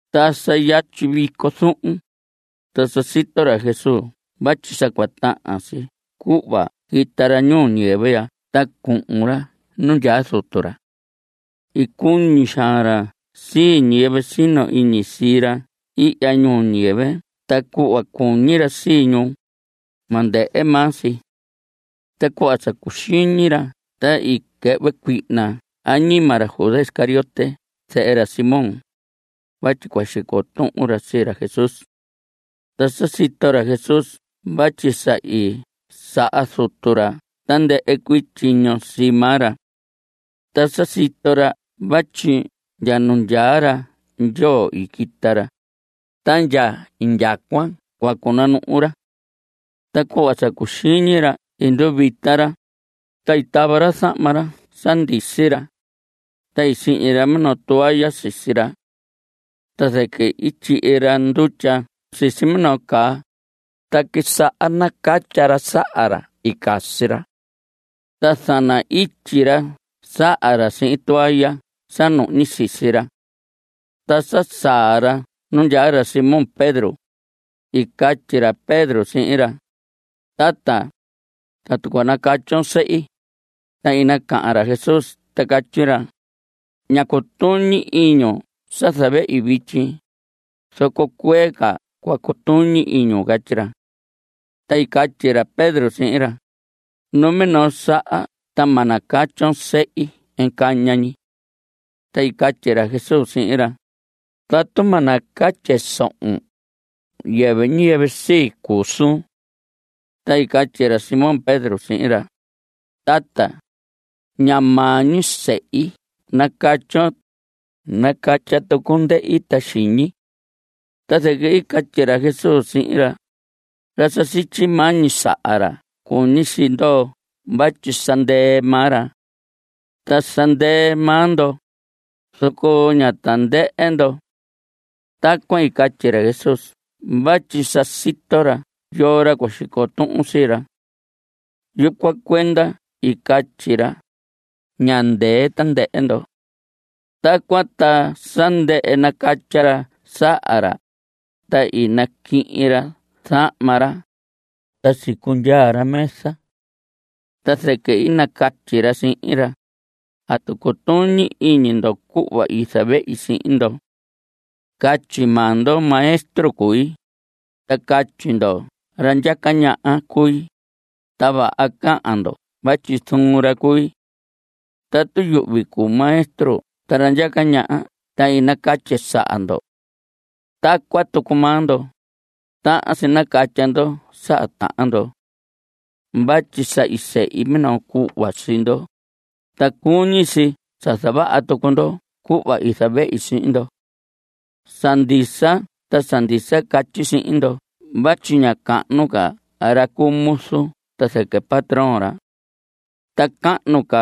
Ta sa yatyi vico zuhun, ta sa sito ra Jesús vatyi sa cua tahan si cuhva quita ra ñuu ñiyɨvɨ ya ta cuhun ra nu ndyaa Zutu ra. I cuñi xaan ra sii ñiyɨvɨ sino iñi sii ra ihya ñuu ñiyɨvɨ ta cuhva cuñi ra sii ñu, ma ndɨhɨ maa si. Ta cuhva sa cuxiñi ra, ta i quɨhvɨ cuihna añima ra Judas Iscariote zehe ra Simón, vatyi cua xico tuhun ra sii ra Jesús. Ta sa sito ra Jesús vatyi sa i saha Zutu ra tandɨhɨ cuii tyiño sii maa ra. Ta sa sito ra vatyi ndya nu ndyaa ra Ndyoo i quita ra, ta ndya indyacuan cua cunanuhu ra. Ta cuhva sa cuxiñi ra i nduvita ra, ta i tava ra zahma sa ndisi ra, ta sihñi ra minoo toalla sisi ra. Ta zɨquɨ i tyihi ra ndutya sisi minoo caa, ta quisaha nacatya ra saha ra i casi ra. Ta zana‑ityi ra saha ra sihin toalla sa nuhñi sisi ra. Ta sa saa ra nu ndyaa ra Simón Pedro, i catyi ra Pedro sihin ra: Tata, ¿atu cua nacatyon sehi? Ta i nacahan ra Jesús ta catyi ra: Ña cutuñi iñun sa zavehi vityi, zoco cuee ca cua cutuñi iñun. Catyi ra. Ta i catyi ra Pedro sihin ra: Numinoo saha ta ma nacatyon sehi caña ñi. Ta i catyi ra Jesús sihin ra: Tatu ma nacatye sohon, yɨvɨ ñiyɨvɨ sii cuu suun. Ta i catyi ra Simón Pedro sihin ra: Tata, ña maa ñi sehi nacatyon, nacatya tucun ndehi ta xiñi. Ta zɨquɨ i catyi ra Jesús sihin ra: Ra sa sityi, maa ñi saha ra cuñi si ndoo vatyi sa ndɨɨ maa ra. Ta sa ndɨɨ maa ndo, zoco ña tandɨhɨ ndo. Tacuan i catyi ra Jesús vatyi sa sito ra yoo ra cua xico tuhun sii ra. Yucuan cuenda i catyi ra: “Ña ndɨɨ tandɨhɨ ndo.” Tacuan ta sa ndɨhɨ nacatya ra saha ra, ta i naquihin ra zahma ra, ta sicundyaa ra mesa. Ta zɨquɨ i nacatyi ra sihin ra: ¿Atu cutuñi iñi ndo cuhva i zavehi sihin ndo? Catyi maa ndo maestro cui, ta catyi ndo ra ndyaca ñaha cui, ta vaha cahan ndo vatyi zuun ra cui. Tatu yuhvi cuu maestro ta ra ndyaca ñaha ta i nacatye saha ndo. Tacuan tucu maa ndo, tahan si nacatya ndo saha tahan ndo. Vatyi sa i sehi minoo cuhva sii ndo, ta cuñi si sa cua zavaha tucu ndo cuhva i zavehi sihin ndo. Sa ndisa ta sa ndisa catyi sihin ndo vatyi ña cahnu ca ra cu muzu ta zɨquɨ patrón ra. Ta cahnu ca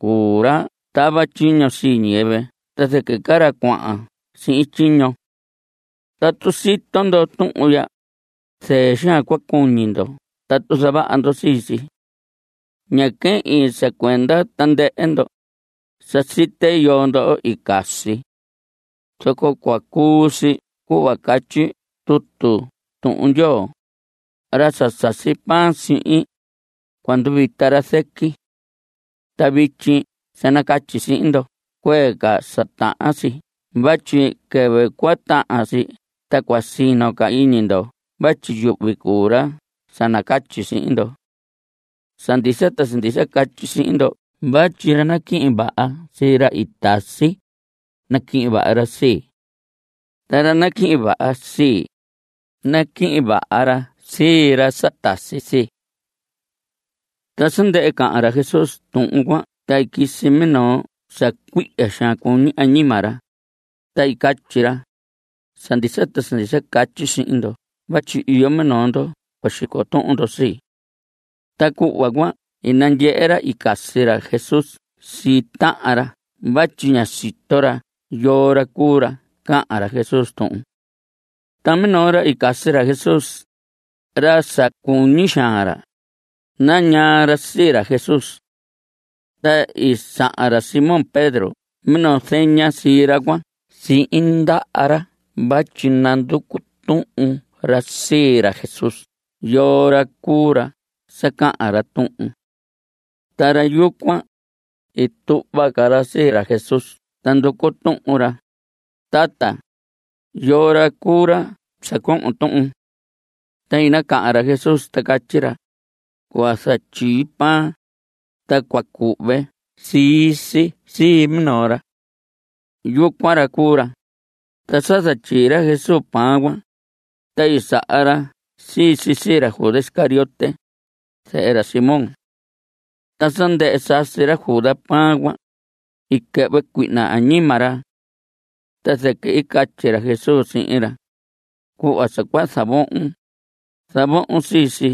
cuu ra tava tyiño sii ñiyɨvɨ ta zɨquɨ ca ra cuahan sihin tyiño. Tatu sito ndo tuhun ya, zɨɨ xaan cua cuñi ndo tatu zavaha ndo sii si. Ña quehin sa cuenda tandɨhɨ ndo. Sa site yoo ndo i casi. Zoco cua cuu si cuhva catyi tutu Tuhun Ndyoo: “Ra sa sasi pan sihin, cua nduvita ra zɨqui.” Ta vityi sa nacatyi sihin ndo cuee ca sa tahan si vatyi quɨvɨ cua tahan si ta cua sino iñi ndo vatyi yuhvi cuu ra sa nacatyi sihin ndo. Sa ndisa ta sa ndisa catyi sihin ndo vatyi ra naquihin vaha sii ra tasi, naquihin vaha ra sii. Ta ra naquihin vaha sii, naquihin vaha ra sii ra sa tasi sii. Ta sa ndɨhɨ cahan ra Jesús tuhun cuan, ta i quisi minoo sa cuihya xaan cuñi añima ra, ta i catyi ra: Sa ndisa ta sa ndisa catyi sihin ndo vatyi iyo minoo ndo cua xico tuhun ndo sii. Ta cuhva cuan i nandyehe ra i casi ra Jesús sii tahan ra vatyi ña sito ra yoo ra cuu ra cahan ra Jesús tuhun. Ta minoo ra i casi ra Jesús, ra sa cuñi xaan ra, nañaa ra sii ra Jesús. Ta i saha ra Simón Pedro minoo zeña sii ra cuan sihin ndaha ra vatyi nanducu tuhun ra sii ra Jesús yoo ra cuu ra sa cahan ra tuhun. Ta ra yucuan, i tuhva ca ra sii ra Jesús ta nducu tuhun ra: Tata, ¿yoo ra cuu ra sa cohon tuhun? Ta i nacahan ra Jesús ta catyi ra: Cua zatyii pan, ta cua cuhve sii si sii minoo ra. Yucuan ra cuu ra. Ta sa zatyii ra Jesús pan cuan, ta i saha ra sii si sii ra Judas Iscariote, zehe ra Simón. Ta sa ndɨhɨ sasi ra Judas pan cuan, i quɨhvɨ cuihna añima ra. Ta zɨquɨ i catyi ra Jesús sihin ra: Cuhva sa cua zavohon, zavohon sii si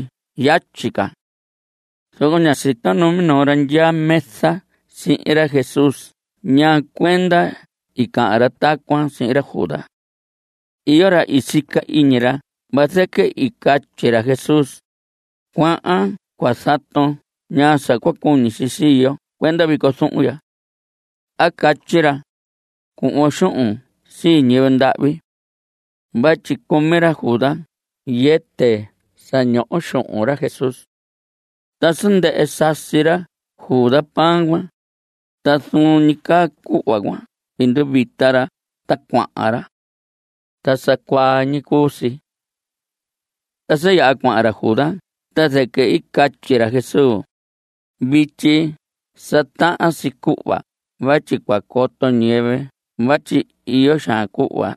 yatyi ca. Zoco ña sito numinoo ra ndyaa mesa sihin ra Jesús ñaa cuenda i cahan ra tacuan sihin ra Judas. Iyo ra i sica iñi ra vazɨquɨ i catyi ra Jesús: “Cuahan cua zaton ñaa sa cua cuñi si sii yo cuenda vico zuhun ya.” A catyi ra: “Cuhvon xuhun sii ñiyɨvɨ ndahvi.” Vatyi cumi ra Judas yɨtɨ sa ñoho xuhun ra Jesús. Ta sa ndɨhɨ sasi ra Judas pan cuan, ta zuun ñi caa cuhva cuan i nduvita ra ta cuahan ra. Ta sa cuaa ñi cuu si. Ta sa yaha cuahan ra Judas ta zɨquɨ i catyi ra Jesús: Vityi sa tahan si cuhva vatyi cua coto ñiyɨvɨ vatyi iyo xaan cuhva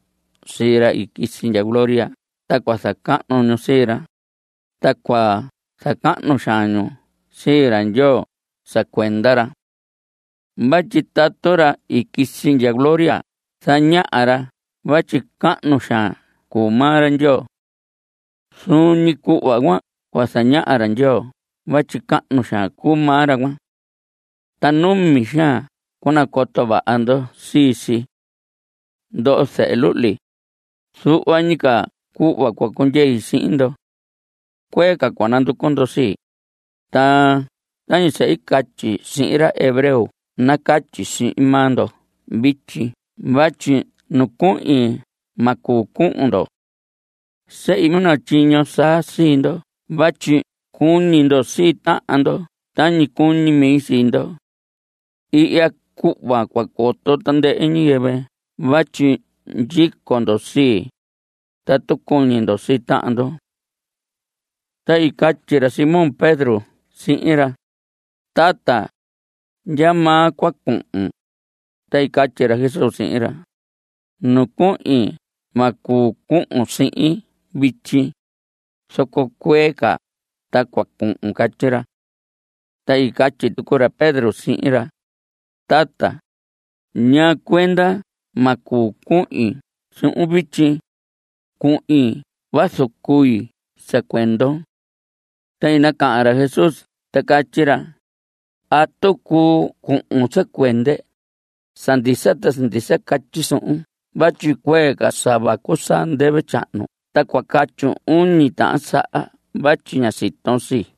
sii ra i quisi ndya gloria ta cua zacahnu ñu sii ra, ta cua zacahnu xaan ñu sii ra Ndyoo sa cuenda ra. Vatyi tatu ra i quisi ndya gloria zañaha ra vatyi cahnu xaan cuu maa ra Ndyoo. Zuun ñi cuhva cuan cua zañaha ra Ndyoo vatyi cahnu xaan cuu maa ra cuan. Ta numi xaan cua nacoto vaha ndo sii si. Ndoho zehe luhli, zuhva ñi ca cuhva cua cundyei sihin ndo. Cuee ca cua nanducu ndo sii, ta tañi sa i catyi sihin ra hebreo nacatyi sihin maa ndo vityi vatyi nu cuhin ma cuu cuhun ndo. Sehi minoo tyiño saa sii ndo vatyi cuñi ndo sii tahan ndo tañi cuñi mi sii ndo. Ihya cuhva cua coto tandɨhɨ ñiyɨvɨ vatyi ndyico ndo sii, tatu cuñi ndo sii tahan ndo. Ta i catyi ra Simón Pedro sihin ra: Tata, ¿ndyamaa cua cuhun? Ta i catyi ra Jesús sihin ra: Nu cuhin ma cuu cuhun sihin vityi, zoco cuee ca ta cua cuhun. Catyi ra. Ta i catyi tucu ra Pedro sihin ra: Tata, ¿ñaa cuenda ma cuu cuhin suhun vityi? Cuhin vazu cui sa cuendon. Ta i nacahan ra Jesús ta catyi ra: ¿Atu cuu cuun sa cuende? Sa ndisa ta sa ndisa catyi suhun vatyi cuee ca sa vacu saa ndɨvɨ tyahnu ta cua catyun uñi tahan saha vatyi ña siton sii.